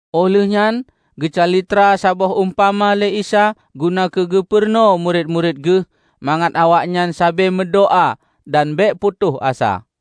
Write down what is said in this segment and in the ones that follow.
Óh lheueh nyan geucalitra saboh umpama lé Isa guna keu geupeurunoe murit-murit geuh mangat awaknyan sabe meudoá dan bék putôh asa.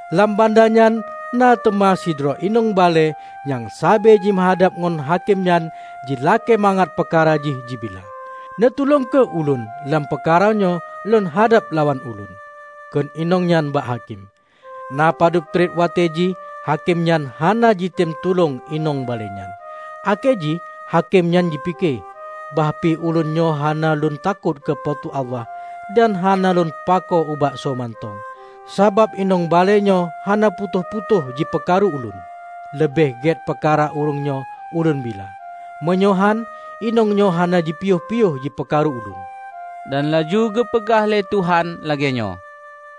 Lam banda nyan na teuma sidroe inong balée nyang sabe jimeuhadab ngon hakém nyan jilakée mangat peukara jih jibila. 'Neutulông kheueh ulôn lampeukara nyoe lôn hadab lawan ulôn.' Kheun inong nyan ubak hakém. Napadub treb watée jih hakém nyan hana jitem tulông inong balée nyan. Akhé jih hakém nyan jipike, 'Bah pih ulôn nyoe hana lôn takot keu Po teu Allah dan hana lôn pakoe ubak soe mantong, sabab inong balée nyoe hana putôh-putôh jipeukaru ulôn, leubeh gét peukara ureuëng nyoe ulôn bila. Meunyoe hán, inong nyoe hana jipiôh-piôh jipeukaru ulôn.' " Dan laju geupeugah lé Tuhan lagée nyoe,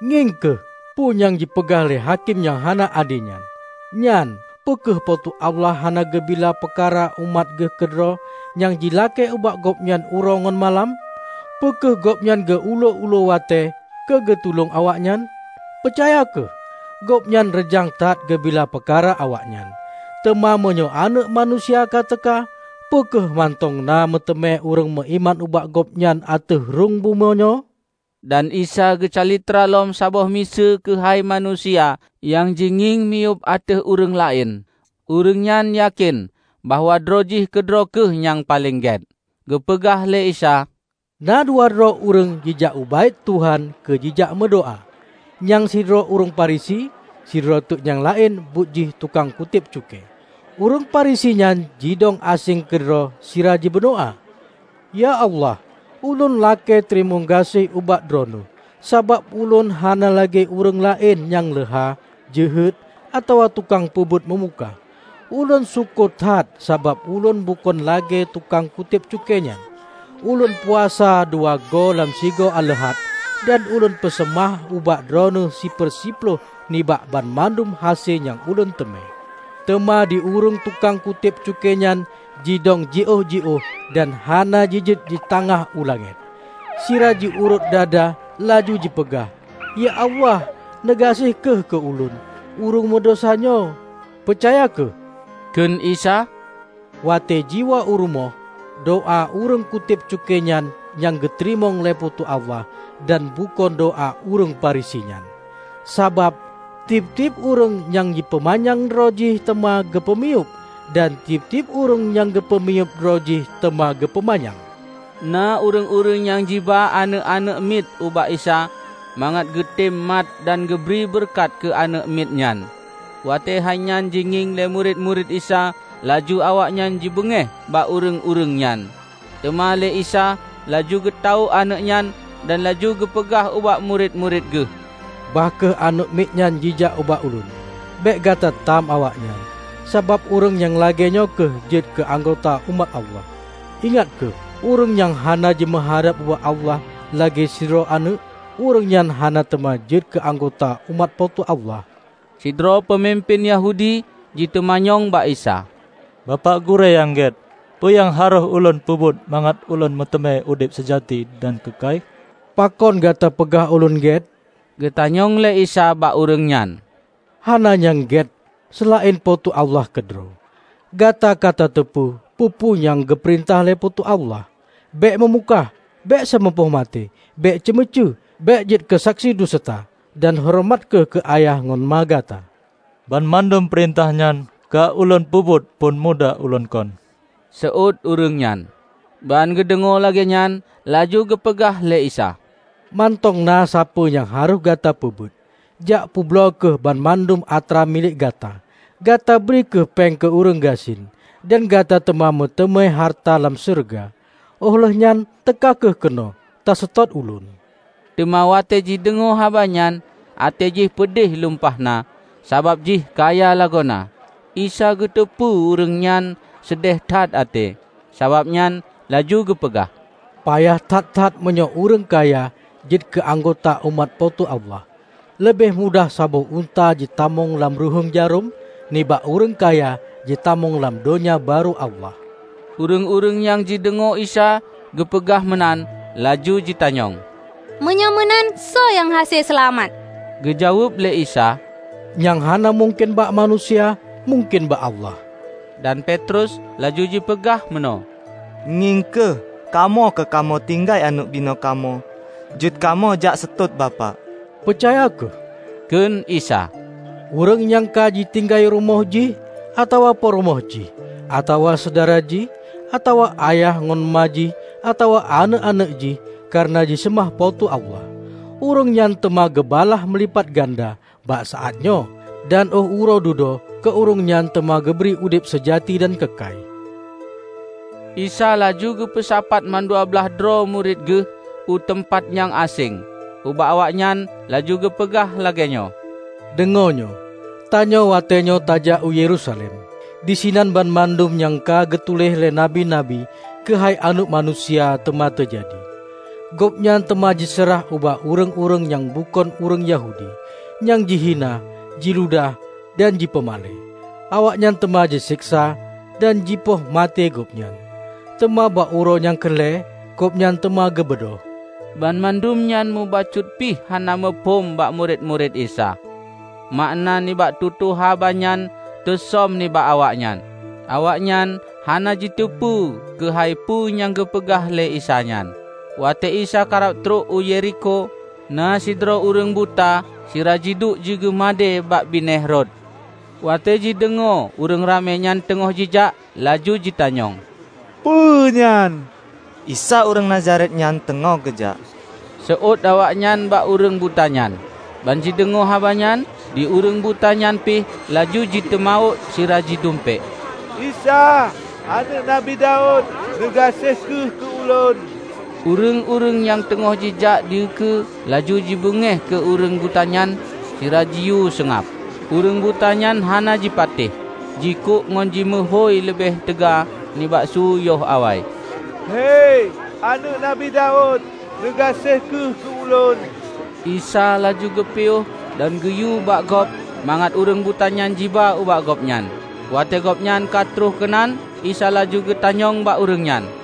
"Ngieng kheueh peu nyang jipeugah lé hakém nyang hana ade nyan! Nyan, peu kheueh Po teu Allah hana geubila peukara umat Geuh keudroe nyang jilakée ubak Gobnyan uroe ngon malam? Peu kheueh Gobnyan geu-ulue-ulue watée keu geutulông awaknyan? Peucaya kheueh: Gobnyan reujang that geubila peukara awaknyan! Teuma meunyoe Aneuëk Manusia ka teuka, peu kheueh mantong na meuteumé ureuëng meuiman ubak Gobnyan ateueh rhueng bumoe nyoe?" Dan Isa geucalitra lom saboh miseue keuhai manusia nyang jingieng miyueb ateueh ureuëng laén, ureuëng nyan yakén bahwa droe jih keudroe kheueh nyang paleng gét. Geupeugah lé Isa, "Na dua droe ureuëng jijak u Baét Tuhan keu jijak meudoá. Nyang sidroe ureuëng Farisi, sidroe teuk nyang laén buet jih tukang kutéb cukée. Ureuëng Farisi nyan jidong aséng keudroe sira jimeudoá, 'Ya Allah, ulôn lakée teurimong gaséh ubak Droeneueh, sabab ulôn hana lagée ureuëng laén, nyang leuha, jeuhet, atawa tukang peubuet meumukah. Ulôn syukoe that sabab ulôn bukon lagée tukang kutéb cukée nyan. Ulôn puasa dua goe lam sigoe aleuhat, dan ulôn peuseumah ubak Droeneueh siper siploh nibak banmandum hase nyang ulôn teumé.' Teuma di ureuëng tukang kutéb cukée nyan jidong jiôh-jiôh dan hana jijeuet jitangah u langét. Sira jiurôt dada laju jipeugah, 'Ya Allah, neugaséh kheueh keu ulôn, ureuëng meudesya nyoe!' " "Peucaya kheueh," kheun Isa, "Watée jiwoe u rumoh, doá ureuëng kutéb cukée nyan nyang geuteurimong lé Po teu Allah dan bukon doá ureuëng Farisi nyan. Sabab tieb-tieb ureuëng nyang jipeumanyang droe jih teuma geupeumiyueb; dan tieb-tieb ureuëng nyang peumiyueb droe jih teuma geupeumanyang." Na ureuëng-ureuëng nyang jiba aneuëk-aneuëk miet ubak Isa mangat geutem mat dan geubri beureukat keu aneuëk miet nyan. Watée hainyan jingieng lé murit-murit Isa laju awaknyan jibeungéh bak ureuëng-ureuëng nyan. Teuma lé Isa laju geutawök aneuëk nyan dan laju geupeugah ubak murit-murit Geuh, "Bah kheueh aneuëk miet nyan jijak bak ulôn! Bék gata tam awaknyan, sabab ureuëng nyang lagée nyoe kheueh jeuet keu anggota umat Allah. Ingat kheueh! Ureuëng nyang hana jimeuhadab ubak Allah lagée sidroe aneuëk, ureuëng nyan hana teuma jeuet keu anggota umat Po teu Allah." Sidroe peumimpén Yahudi jiteumanyong bak Isa, "Bapak Gurée nyang gét, peu nyang harôh ulôn peubuet mangat ulôn meuteumé udeb seujati dan keukai?" "Pakon gata peugah Ulôn gét?" geutanyong lé Isa bak ureuëng nyan. "Hana nyang gét, seulaén Po teu Allah keudroe. Gata ka tateupeue peue-peue nyang geupeurintah lé Po teu Allah: 'Bék meumukah, bék seumeupoh maté, bék ceumeucue, bék jeuet keusaksi duseuta, dan horeumat kheueh keu ayah ngon ma gata.' " "Banmandum peurintah nyan ka ulôn peubuet phon muda ulôn kon," seuôt ureuëng nyan. Ban geudeungoe lagée nyan, laju geupeugah lé Isa, "Mantong na sapeue nyang harôh gata peubuet: Jak peubloe kheueh banmandum atra milék gata, gata bri kheueh péng keu ureuëng gasien, dan gata teuma meuteumé hareuta lam syeuruga. Óh lheueh nyan teuka kheueh keunoe taseutôt Ulôn." Teuma watée jideungoe haba nyan, até jih peudeh lumpah na sabab jih kaya lagoena. Isa geuteupeue ureuëng nyan seudéh that até, sabab nyan laju geupeugah, "Payah that-that meunyoe ureuëng kaya jeuet keu anggota umat Po teu Allah! Leubeh mudah saboh unta jitamong lam ruhuéng jarôm, nibak ureuëng kaya jitamong lam Donya Barô Allah." Ureuëng-ureuëng nyang jideungoe Isa geupeugah meunan laju jitanyong, "Meunyoe meunan, soe nyang hase seulamat?" Geujaweueb lé Isa, "Nyang hana mungken bak manusia, mungken bak Allah!" Dan Petrus laju jipeugah meunoe, "Ngieng kheueh! Kamoe ka kamoe tinggai aneuëk binoe kamoe jeuet kamoe jak seutôt Bapak." "Peucaya kheueh!" kheun Isa. "Ureuëng nyang ka jitinggai rumoh jih, atawa peurumoh jih, atawa syedara jih, atawa ayah ngon ma jih atawa aneuëk-aneuëk jih kareuna jiseumah Po teu Allah, ureuëng nyan teuma geubalaih meulipat ganda bak saát nyoe, dan óh uroe dudoe keu ureuëng keu teuma geubri udeb seujati dan keukai." Isa laju geupeusapat mandua blaih droe murit Geuh u teumpat nyang aséng, ubak awaknyan laju geupeugah lagée nyoe, "Deungoe nyoe! Tanyoe watée nyoe tajak u Yerusalem. Disinan, banmandum nyang ka geutuléh lé Nabi-nabi keuhai Aneuëk Manusia, teuma teujadi. Gobnyan teuma jiseurah ubak ureuëng-ureuëng nyang bukon ureuëng Yahudi, nyang jihina, jiludah dan jipeumalée. Awaknyan teuma jiseksa dan jipoh maté Gobnyan, teuma bak uroe nyang keu lhée, Gobnyan teuma geubeudôh." Banmandum nyan mubacut pih hana muphom bak murit-murit Isa. Makna nibak tutoe haba nyan teusöm nibak awaknyan. Awaknyan hana jiteupeue keuhai peue nyang geupeugah lé Isa nyan. Watée Isa karab trok u Yerikho, na sidroe ureuëng buta sira jiduek jigeumadée bak binéh rot. Watée jideungoe ureuëng ramé nyan teungoh jijak, laju jitanyong, "Peue nyan?" "Isa ureuëng Nazaret nyan teungoh geujak," Seuôt awaknyan bak ureuëng buta nyan. Ban jideungoe haba nyan, di ureuëng buta nyan pih laju jiteumawök sira jidumpék, "Isa, aneuëk Nabi Daud! Neugaséh kheueh keu ulôn!" Ureuëng-ureuëng nyang teungoh jijak dikeue laju jibeungéh keu ureuëng buta nyan sira jiyue seungab. Ureuëng buta nyan hana jipatéh jikuk ngon jimeuhôi leubeh teuga nibak su yoh awai, "Hei Aneuëk Nabi Daud, neugaséh kheueh keu ulôn!" Isa laju geupiôh dan geuyue bak gob mangat ureuëng butanyan jiba ubak Gobnyan. Watée gobnyan ka troh keunan, Isa laju geutanyong bak ureuëng nyan,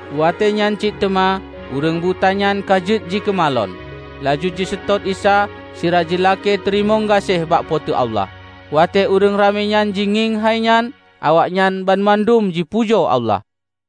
Watée nyan cit teuma ureuëng buta nyan ka jeuet jikeumalon, laju jiseutôt Isa sira jilakée teurimong gaséh bak Po teu Allah. Watée ureuëng ramé nyan jingieng hai nyan, awaknyan banmandum jipujoe Allah.